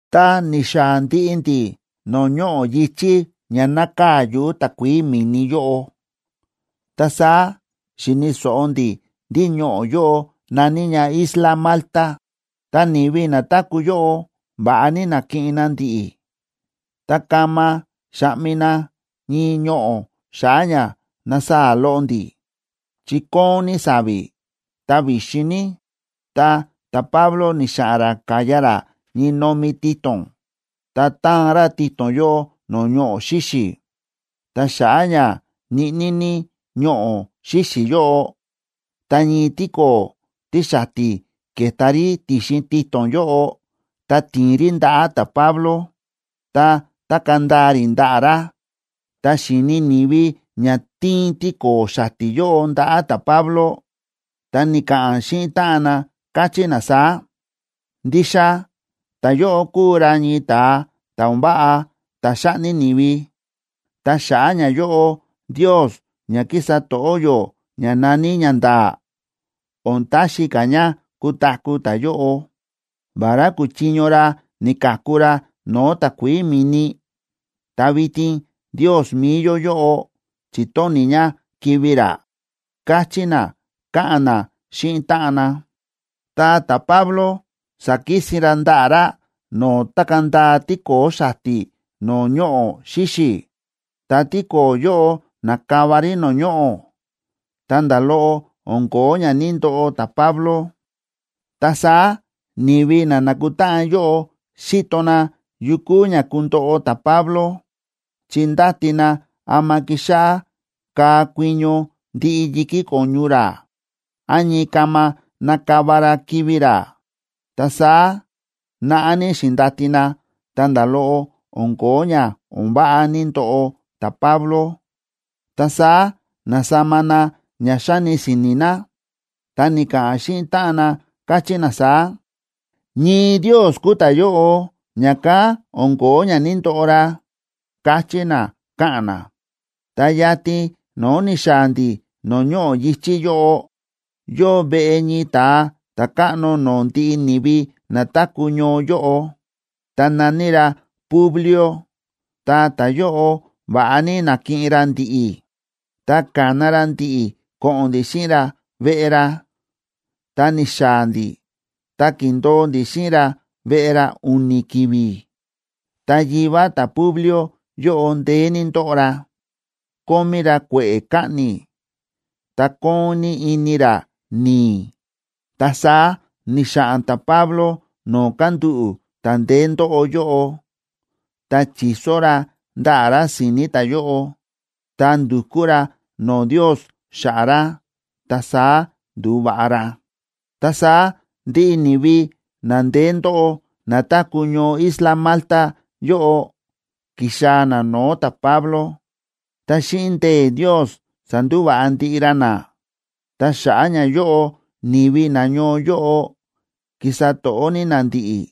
Tá ni̱xaa̱ ndiꞌi ndi̱ no̱o̱ ñoꞌo̱ yi̱chí ña nákaa̱ yuꞌu̱ takuií mi̱ni yóꞌo, ta saá xi̱ni̱ so̱ꞌo ndi̱ ndí ñoꞌo̱ yóꞌo na̱ní ña isla Malta. Ta ni̱vi na táku̱ yóꞌo, va̱ꞌa ní na̱kiꞌin na ndi̱ꞌi̱. Ta kama xa̱ꞌmi na ñii ñoꞌo̱ xa̱ꞌa̱ ña nasaa̱ loꞌo ndi̱, chi kóon ní sa̱vi̱, ta vi̱xin ní. Ta ta̱Pablo ni̱xa̱ꞌa̱n ra ka̱ya ra ñii nomi tito̱n, ta ta̱an ra tito̱n yóꞌo no̱o̱ ñoꞌo̱ xíxi̱. Ta xa̱ꞌa̱ ña ñiꞌní ní ñoꞌo̱ xíxi̱ yóꞌo, ta ñii tíko̱o̱ tíxati̱ ke̱ta rí ti̱xin tito̱n yóꞌo, ta ti̱in rí ndaꞌa̱ ta̱Pablo, ta tákaa̱ ndaa rí ndaꞌa̱ ra. Tá xi̱ni ni̱vi ña ti̱in tíko̱o̱ xati̱ yóꞌo ndaꞌa̱ ta̱Pablo, ta ni̱ka̱ꞌa̱n xíꞌin táꞌan na, káchí na saá: ―Ndixa ta̱yóꞌo kúu ra ñii ta̱a ta̱ o̱n váꞌa ta̱ xa̱ꞌni ni̱vi, ta xa̱ꞌa̱ ñayóꞌo ndios ña kísa to̱ꞌó yó ña na̱ní “ñanda̱a̱” o̱n taxi ka̱ ña kutaku̱ ta̱yóꞌo. Vará ku̱chiño ra ni̱ka̱ku ra no̱o̱ takuií mi̱ni, ta vitin ndios mi̱i yó yóꞌo chi̱tóni̱ ña kivi̱ ra ―káchí na, káꞌa̱n na xíꞌin táꞌan na. Ta ta̱Pablo sa̱kisin ra ndaꞌa̱ ra no̱o̱ tákaa̱ ndaa tíko̱o̱ xati̱ no̱o̱ ñoꞌo̱ xíxi̱, ta tíko̱o̱ yóꞌo na̱kava rí no̱o̱ ñoꞌo̱, ta nda̱ loꞌo o̱n ko̱ó ña ní‑ndoꞌo ta̱Pablo. Ta saá ni̱vi na̱kutáꞌan yóꞌo xíto na yu kúu ña kundoꞌo ta̱Pablo, chi ndáti na ama kixáꞌá kaa kuiño ndiꞌi yi̱kí ko̱ñu ra, án ñii kama nakava ra kivi̱ ra. Ta saá naꞌá ní xi̱ndati na, ta nda̱ loꞌo o̱n ko̱ó ña o̱n váꞌa ní‑ndoꞌo ta̱Pablo. Ta saá na̱sama na ña xáni si̱ni̱ na, ta ni̱ka̱ꞌa̱n xíꞌin táꞌan na, káchí na saá: ―Ñii ndios kúu ta̱yóꞌo, ña̱kán o̱n ko̱ó ña ní‑ndoꞌo ra ―káchí na, káꞌa̱n na. Ta yatin no̱o̱ ni̱xaa̱ ndi̱ no̱o̱ ñoꞌo̱ yi̱chí yóꞌo, yóo veꞌe ñii ta̱a ta̱káꞌno no̱o̱ ndiꞌi ni̱vi na táku̱ ñoo yóꞌo, ta na̱ní ra Publio. Ta ta̱yóꞌo va̱ꞌa ní na̱kiꞌin ra ndi̱ꞌi̱, ta ka̱na ra ndi̱ꞌi̱ ko̱ꞌo̱n ndi̱ xíꞌin ra veꞌe ra. Ta ni̱xaa̱ ndi̱ ta ki̱ndo̱o ndi̱ xíꞌin ra veꞌe ra u̱ni̱ ki̱vi̱. Ta yivá ta̱Publio yóꞌo ndeé ní ndóꞌo ra, kómí ra kue̱ꞌe̱ kaꞌni̱, ta kóon ní ini ra ni̱i̱. Ta saá ni̱xa̱ꞌa̱n ta̱Pablo no̱o̱ kándúꞌu̱ ta̱ ndeé ndóꞌo yóꞌo, ta chi̱so ra ndaꞌa̱ ra si̱ni̱ ta̱yóꞌo, ta ndu̱kú ra no̱o̱ Ndios xa̱ꞌa̱ ra, ta saá ndu̱va̱ꞌa ra. Ta saá ndiꞌi ni̱vi na ndeé ndóꞌo, na táku̱ ñoo isla Malta yóꞌo, ki̱xaa̱ na no̱o̱ ta̱Pablo, ta xíꞌin ndee̱ Ndios sa̱ndúva̱ꞌa ndiꞌi ra na. Ta xa̱ꞌa̱ ñayóꞌo, ni̱vi nañoo yóꞌo ki̱sa to̱ꞌó ní na ndi̱ꞌi̱,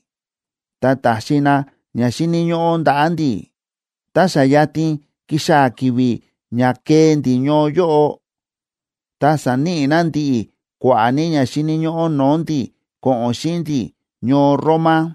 ta ta̱xi na ña xíni̱ ñóꞌó ndaꞌa̱ ndi̱. Tá xa yatin kixaa̱ ki̱vi̱ ña kee ndi̱ ñoo yóꞌo, ta sa̱níꞌi na ndi̱ꞌi̱ kua̱ꞌa̱ ní ña xíni̱ ñóꞌó no̱o̱ ndi̱ ko̱ꞌo̱n xíꞌin ndi̱ ñoo Roma.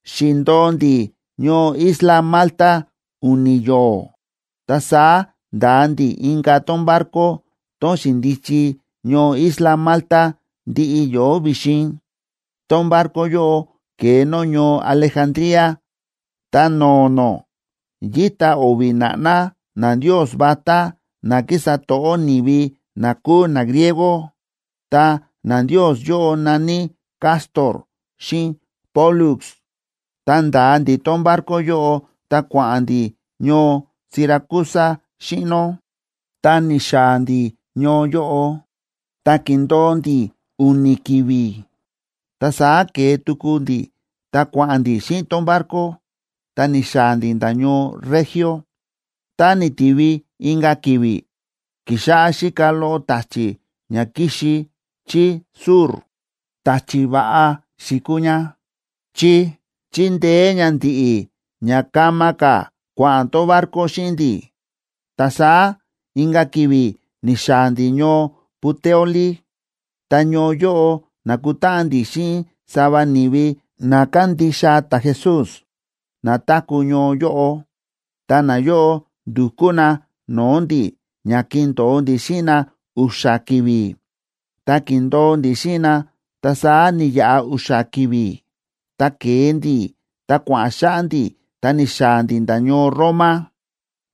Xi̱ndo̱o ndi̱ ñoo isla Malta u̱ni̱ yo̱o̱, ta saá nda̱a ndi̱ inka̱ tón barco, tón xi̱ndichi ñoo isla Malta ndiꞌi yo̱o̱ vi̱xin. Tón barco yóꞌo ke̱e nó ñoo Alejandría, ta no̱o̱ nó, yíta o̱vi̱ na̱ꞌná nandios vatá na kísa to̱ꞌó ni̱vi na kúu nagriego, ta nandios yóꞌo na̱ní Cástor xíꞌin Pólux. Ta nda̱a ndi̱ tón barco yóꞌo, ta kua̱ꞌa̱n ndi̱ ñoo Siracusa xíꞌin nó. Tá ni̱xaa̱ ndi̱ ñoo yóꞌo, ta ki̱ndo̱o ndi̱ u̱ni̱ ki̱vi̱. Ta saá ke̱e tuku ndi̱ ta kua̱ꞌa̱n ndi̱ xíꞌin tón barco, ta ni̱xaa̱ ndi̱ nda̱ ñoo Regio. Tá ni̱tivi inka̱ ki̱vi̱, ki̱xáꞌá xíka loꞌo ta̱chi̱ ña ki̱xi chí sur, ta̱chi̱ va̱ꞌa xi̱kuu ña, chi chi̱ndeé ña ndi̱ꞌi̱ ña kama ka̱ kua̱ꞌa̱n tón barco xíꞌin ndi̱. Ta saá inka̱ ki̱vi̱ ni̱xaa̱ ndi̱ ñoo Puteoli. Ta ñoo yóꞌo na̱kutáꞌan ndi̱ xíꞌin sava ni̱vi na kándixa ta̱Jesús, na táku̱ ñoo yóꞌo. Ta nayóꞌo ndu̱kú na no̱o̱ ndi̱ ña kindo̱o ndi̱ xíꞌin na u̱xa̱ ki̱vi̱. Ta ki̱ndo̱o ndi̱ xíꞌin na, ta saá ni̱yaꞌa u̱xa̱ ki̱vi̱, ta ke̱e ndi̱, ta kua̱ꞌa̱n xáꞌá ndi̱ ta ni̱xaa̱ ndi̱ nda̱ ñoo Roma.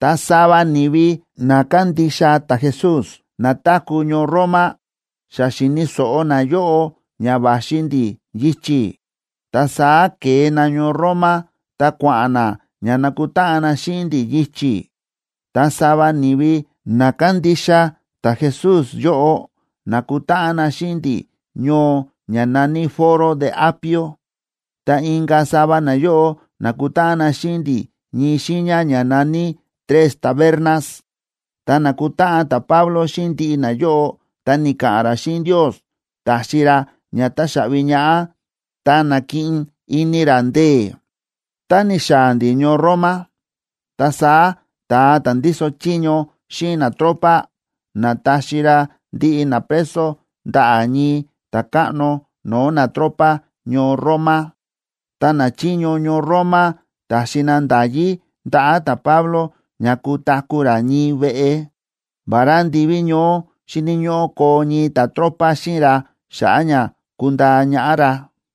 Ta sava ni̱vi na kándixa ta̱Jesús na táku̱ ñoo Roma, xa xi̱ni̱ so̱ꞌo nayóꞌo ña va̱xi ndi̱ yichi̱. Ta saá ke̱e na ñoo Roma, ta kua̱ꞌa̱n na ña nakutáꞌan na xíꞌin ndi̱ yichi̱. Ta sava ni̱vi na kándixa ta̱Jesús yóꞌo na̱kutáꞌan na xíꞌin ndi̱ ñoo ña na̱ní Foro de Apio, ta inka̱ sava nayóꞌo na̱kutáꞌan na xíꞌin ndi̱ ñii xiiña ña na̱ní Tres Tabernas. Tá na̱kutáꞌan ta̱Pablo xíꞌin ndiꞌi nayóꞌo, ta ni̱ka̱ꞌa̱n ra xíꞌin Ndios, ta̱xi ra ña táxaꞌvi ñaꞌá, ta na̱kiꞌin ini ra ndee̱. Tá ni̱xaa̱ ndi̱ ñoo Roma, ta saá ta̱a ta̱ ndíso chiño xíꞌin natropa na̱taxi ra ndiꞌi napreso ndaꞌa̱ ñii ta̱káꞌno no̱o̱ natropa ñoo Roma. Ta nachiño ñoo Roma ta̱xi na nda̱yí ndaꞌa̱ ta̱Pablo ña kutaku̱ ra ñii veꞌe, vará ndiví ñoó xíni̱ ñóꞌó koo ñii ta̱tropa xíꞌin ra xa̱ꞌa̱ ña kundaa ñaꞌá ra.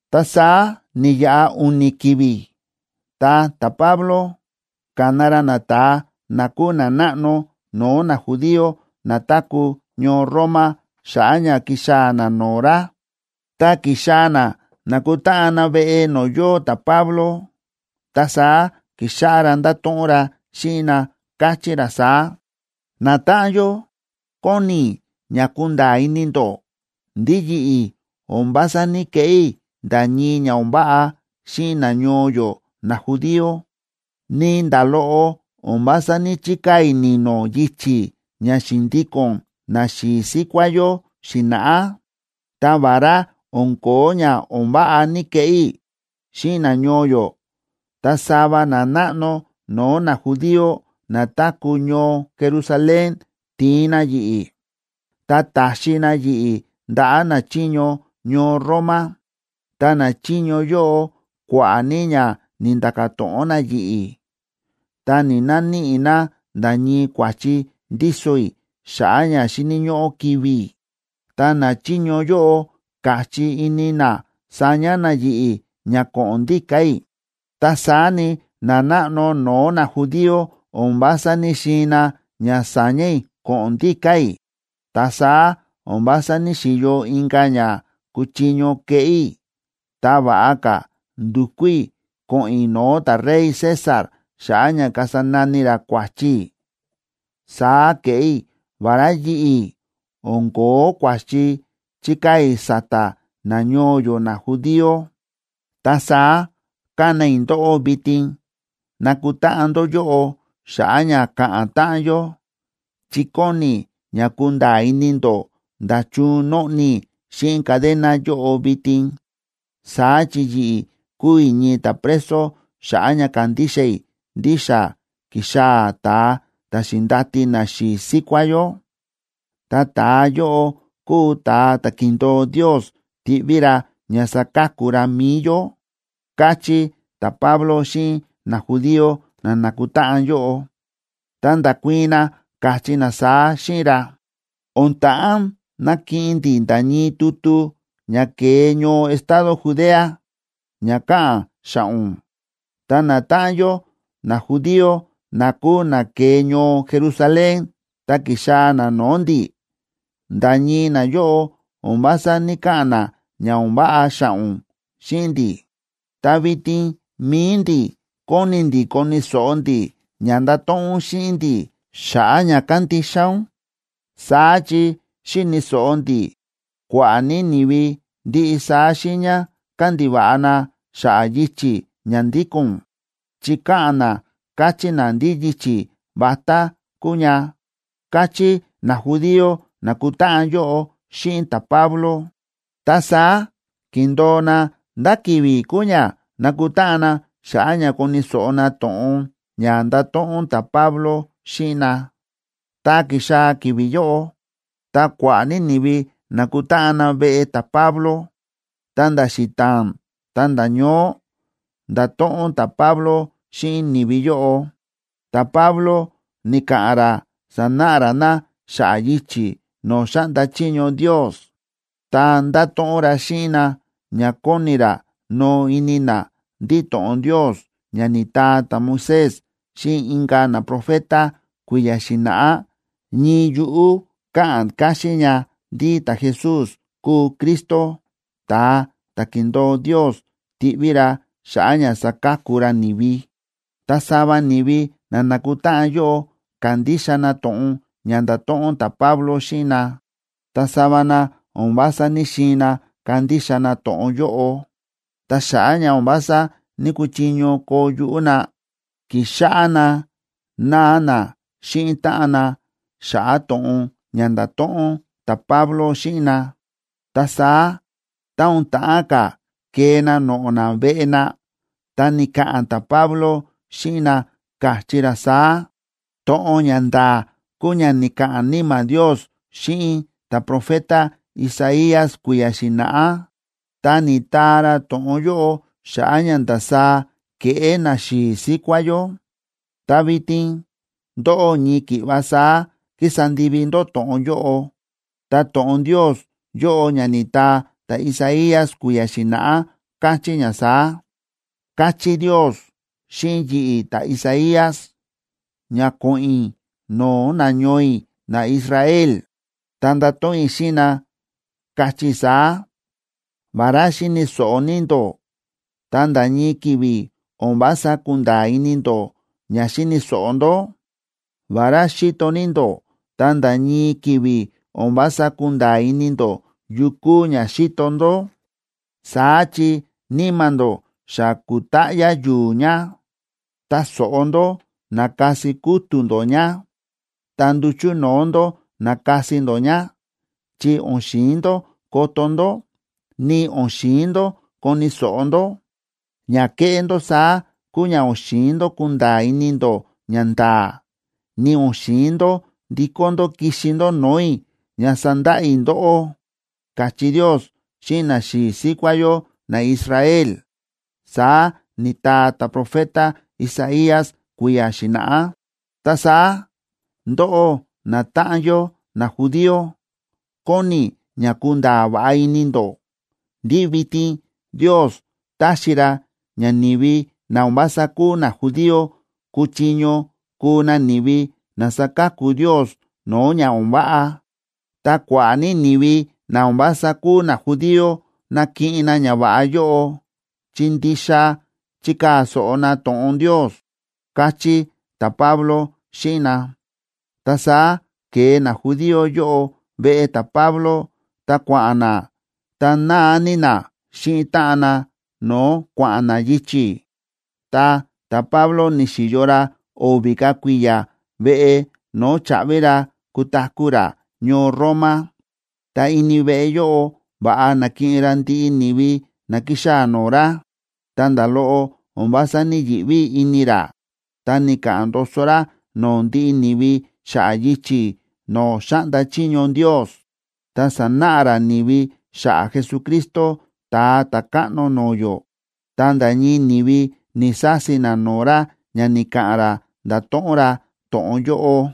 Ta saá ni̱yaꞌa u̱ni̱ ki̱vi̱, ta ta̱Pablo ka̱na ra nata̱a na kúu nanáꞌno no̱o̱ najudío na táku̱ ñoo Roma xa̱ꞌa̱ ña kixaa̱ na no̱o̱ ra. Tá ki̱xaa̱ na na̱kutáꞌan na veꞌe no̱o̱ yóo ta̱Pablo, ta saá ki̱xáꞌá ra ndáto̱ꞌon ra xíꞌin na, káchí ra saá: ―Natáꞌan yó, kóni i̱ ña kunda̱a̱ ini ndó ndí yi̱ꞌi̱ o̱n vása ní‑keꞌé i̱ nda̱ ñii ña o̱n váꞌa xíꞌin nañoo yó najudío, ni nda̱ loꞌo o̱n vása ní‑chikaa̱ i̱ ni̱no̱ yichi̱ ña xi̱ndíko̱n naxi̱i̱ síkuá yó xi̱na̱ꞌá. Ta vará o̱n ko̱ó ña o̱n váꞌa ní‑keꞌé i̱ xíꞌin nañoo yó, ta sava nanáꞌno no̱o̱ najudío na táku̱ ñoo Jerusalén ti̱in na yi̱ꞌi̱, ta ta̱xi na yi̱ꞌi̱ ndaꞌa̱ nachiño ñoo Roma. Ta nachiño yóꞌo, kua̱ꞌa̱ ní ña ni̱nda̱ka̱ to̱ꞌon na yi̱ꞌi̱, ta ni̱‑naníꞌi na nda̱ ñii kua̱chi ndíso i̱ xa̱ꞌa̱ ña xíni̱ ñóꞌó kivi̱ i̱. Ta nachiño yóꞌo ka̱chí ini na saña na yi̱ꞌi̱ ña ko̱ꞌo̱n ndíka̱ i̱. Ta saá ni, nanáꞌno no̱o̱ najudío o̱n vása ní‑xiin na ña sa̱ña̱ i̱ ko̱ꞌo̱n ndíka̱ i̱. Ta saá o̱n vása ní‑xiyo inka̱ ña kuchiño keꞌé i̱, ta va̱ꞌa ka̱ ndu̱kú i̱ ko̱ꞌo̱n i̱ no̱o̱ ta̱rey César xa̱ꞌa̱ ña kasa nani ra kua̱chi i̱. Saá ke̱ꞌé i̱, vará yi̱ꞌi̱ o̱n ko̱ó kua̱chi chíkaa̱ i̱ sa̱ta̱ nañoo yó najudío. Ta saá ka̱na i̱ ndóꞌó vitin nakutáꞌan ndó yóꞌo xa̱ꞌa̱ ña ka̱ꞌa̱n táꞌan yó, chi kóni i̱ ña kunda̱a̱ ini ndó nda̱chun nóꞌni i̱ xíꞌin cadena yóꞌo vitin. Saá chi yi̱ꞌi̱ kúu i̱ ñii ta̱preso xa̱ꞌa̱ ña kándixa i̱ ndí xa ki̱xaa̱ ta̱a ta̱ xi̱ndati naxi̱i̱ síkuá yó. Ta ta̱a yóꞌo kúu ta̱a ta̱ ki̱ndo̱o Ndios tiꞌví ra ña saka̱ku ra mi̱i yó ―káchí ta̱Pablo xíꞌin najudío na na̱kutáꞌan yóꞌo. Ta nda̱kuii̱n na, káchí na saá xíꞌin ra: ―O̱n ta̱ꞌán nakiꞌin ndi̱ nda̱ ñii tutu ña ke̱e ñoo estado Judea ña káꞌa̱n xa̱ꞌa̱ ún, ta natáꞌan yó najudío na kúu na ke̱e ñoo Jerusalén ta ki̱xaa̱ na no̱o̱ ndi̱, nda̱ ñii nayóꞌo o̱n vása ní‑kaꞌa̱n na ña o̱n váꞌa xa̱ꞌa̱ ún xíꞌin ndi̱. Ta vitin mi̱i ndi̱ kóni ndi̱ koni̱ so̱ꞌo ndi̱ ña ndato̱ꞌon ún xíꞌin ndi̱ xa̱ꞌa̱ ña kándixa ún. Saá chi xi̱ni̱ so̱ꞌo ndi̱ kua̱ꞌa̱ ní ni̱vi ndiꞌi saá xiiña kándiva̱ꞌa na xa̱ꞌa̱ yichi̱ ña ndíko̱n ún, chi káꞌa̱n na káchí na ndí yichi̱ vatá kúu ña ―káchí najudío na̱kutáꞌan yóꞌo xíꞌin ta̱Pablo. Ta saá ki̱ndo̱o na ndá ki̱vi̱ kuu ña nakutáꞌan na xa̱ꞌa̱ ña koni̱ so̱ꞌo na to̱ꞌon ña ndato̱ꞌon ta̱Pablo xíꞌin na. Tá ki̱xaa̱ ki̱vi̱ yóꞌo, ta kua̱ꞌa̱ ní ni̱vi na̱kutáꞌan na veꞌe ta̱Pablo. Ta nda̱ xita̱a̱n ta̱nda̱ ñoó, nda̱to̱ꞌon ta̱Pablo xíꞌin ni̱vi yóꞌo. Ta̱Pablo ni̱ka̱ꞌa̱n ra sa̱náꞌa káxín ra na xa̱ꞌa̱ yichi̱ no̱o̱ xáꞌnda chiño Ndios, ta nda̱to̱ꞌon ra xíꞌin na, chi kóni ra kunda̱a̱ ini na ndí to̱ꞌon Ndios ña ni̱taa ta̱Moisés xíꞌin inka̱ naprofeta kui̱ya̱ xi̱na̱ꞌá, ñii yuꞌú káꞌa̱n ña ndí ta̱Jesús kúu Cristo, ta̱a ta̱ ki̱ndo̱o Ndios tiꞌví ra xa̱ꞌa̱ ña saka̱ku ra ni̱vi. Ta sava ni̱vi na na̱kutáꞌan yóꞌo ka̱ndixa na to̱ꞌon ña nda̱to̱ꞌon ta̱Pablo xíꞌin na, ta sava na o̱n vása ní‑xiin na kandixa na to̱ꞌon yóꞌo. Ta xa̱ꞌa̱ ña o̱n vása ní‑kuchiño koo yuꞌú na, ki̱xáꞌá na náa na xíꞌin táꞌan na xa̱ꞌa̱ to̱ꞌon ña nda̱to̱ꞌon ta̱Pablo xíꞌin na. Ta saá tá o̱n ta̱ꞌán ka̱ kee na noꞌo̱ na veꞌe na, ta ni̱ka̱ꞌa̱n ta̱Pablo xíꞌin na, káchí ra saá: ―To̱ꞌon ña nda̱a̱ kúu ña ni̱ka̱ꞌa̱n Níma̱ Ndios xíꞌin ta̱profeta Isaías kui̱ya̱ xi̱na̱ꞌá, ta ni̱taa ra to̱ꞌon yóꞌo xa̱ꞌa̱ ña ndasaá ke̱ꞌé naxi̱i̱ síkuá yó. Ta vitin ndóꞌó ñii ki̱ꞌva saá kísa ndivi ndó to̱ꞌon yóꞌo. Ta to̱ꞌon Ndios yóꞌo ña ni̱taa ta̱Isaías kui̱ya̱ xi̱na̱ꞌá, káchí ña saá: Ka̱chí Ndios xíꞌin yi̱ꞌi̱, ta̱Isaías, ña ko̱ꞌo̱n i̱ no̱o̱ nañoo i̱ naIsrael, ta ndato̱ꞌon i̱ xíꞌin na, kachí i̱ saá: “Vará xíni̱ so̱ꞌo ní ndó, ta nda̱ ñii ki̱vi̱ o̱n vása kunda̱a̱ ini ndó ña xíni̱ so̱ꞌo ndó. Vará xíto ní ndó, ta nda̱ ñii ki̱vi̱ o̱n vása kunda̱a̱ ini ndó yu kúu ña xíto ndó. Saá chi níma̱ ndó xa ku̱táꞌyá yu̱u̱ ña. Ta so̱ꞌo ndó, na̱kasi kútu̱ ndó ña, ta nduchu̱ no̱o̱ ndó, na̱kasi ndó ña, chi o̱n xi̱in ndó koto ndó, ni o̱n xi̱in ndó koni̱ so̱ꞌo ndó. Ña kéꞌé ndó saá kúu ña o̱n xi̱in ndó kunda̱a̱ ini ndó ñanda̱a̱, ni o̱n xi̱in ndó ndikó ndó kixi ndó no̱o̱ i̱ ña sandaꞌa i̱ ndóꞌó”, káchí Ndios xíꞌin naxi̱i̱ síkuá yó naIsrael, saá ni̱taa ta̱profeta Isaías kui̱ya̱ xi̱na̱ꞌá. Ta saá, ndóꞌó natáꞌan yó najudío, kóni i̱ ña kunda̱a̱ va̱ꞌa ini ndó ndí vitin Ndios táxi ra ña ni̱vi na o̱n vása kúu najudío kúchiño kuu na ni̱vi na saka̱ku Ndios no̱o̱ ña o̱n váꞌa. Ta kua̱ꞌa̱ ní ni̱vi na o̱n vása kúu najudío nakiꞌin na ñava̱ꞌa yóꞌo, chi ndixa chikaa̱ so̱ꞌo na to̱ꞌon Ndios ―káchí ta̱Pablo xíꞌin na. Ta saá ke̱e najudío yóꞌo veꞌe ta̱Pablo, ta kua̱ꞌa̱n na, ta náa ní na xíꞌin táꞌan na no̱o̱ kua̱ꞌa̱n na yichi̱. Ta ta̱Pablo ni̱xi̱yo ra o̱vi̱ ka̱ kui̱ya̱ veꞌe no̱o̱ cháꞌvi ra kutaku̱ ra ñoo Roma. Ta ini veꞌe yóꞌo va̱ꞌa na̱kiꞌin ra ndiꞌi ni̱vi na ki̱xaa̱ no̱o̱ ra, ta nda̱ loꞌo o̱n vása ní‑yiꞌví ini ra, ta ni̱ka̱ꞌa̱n ndoso ra no̱o̱ ndiꞌi ni̱vi xa̱ꞌa̱ yichi̱ no̱o̱ xáꞌnda chiño Ndios, ta sa̱náꞌa ra ni̱vi xa̱ꞌa̱ Jesucristo, Ta̱a Ta̱káꞌno no̱o̱ yó. Ta nda̱ ñii ni̱vi ni̱‑sasi na no̱o̱ ra ña ni̱ka̱ꞌa̱n ra nda̱to̱ꞌon ra to̱ꞌon yóꞌo.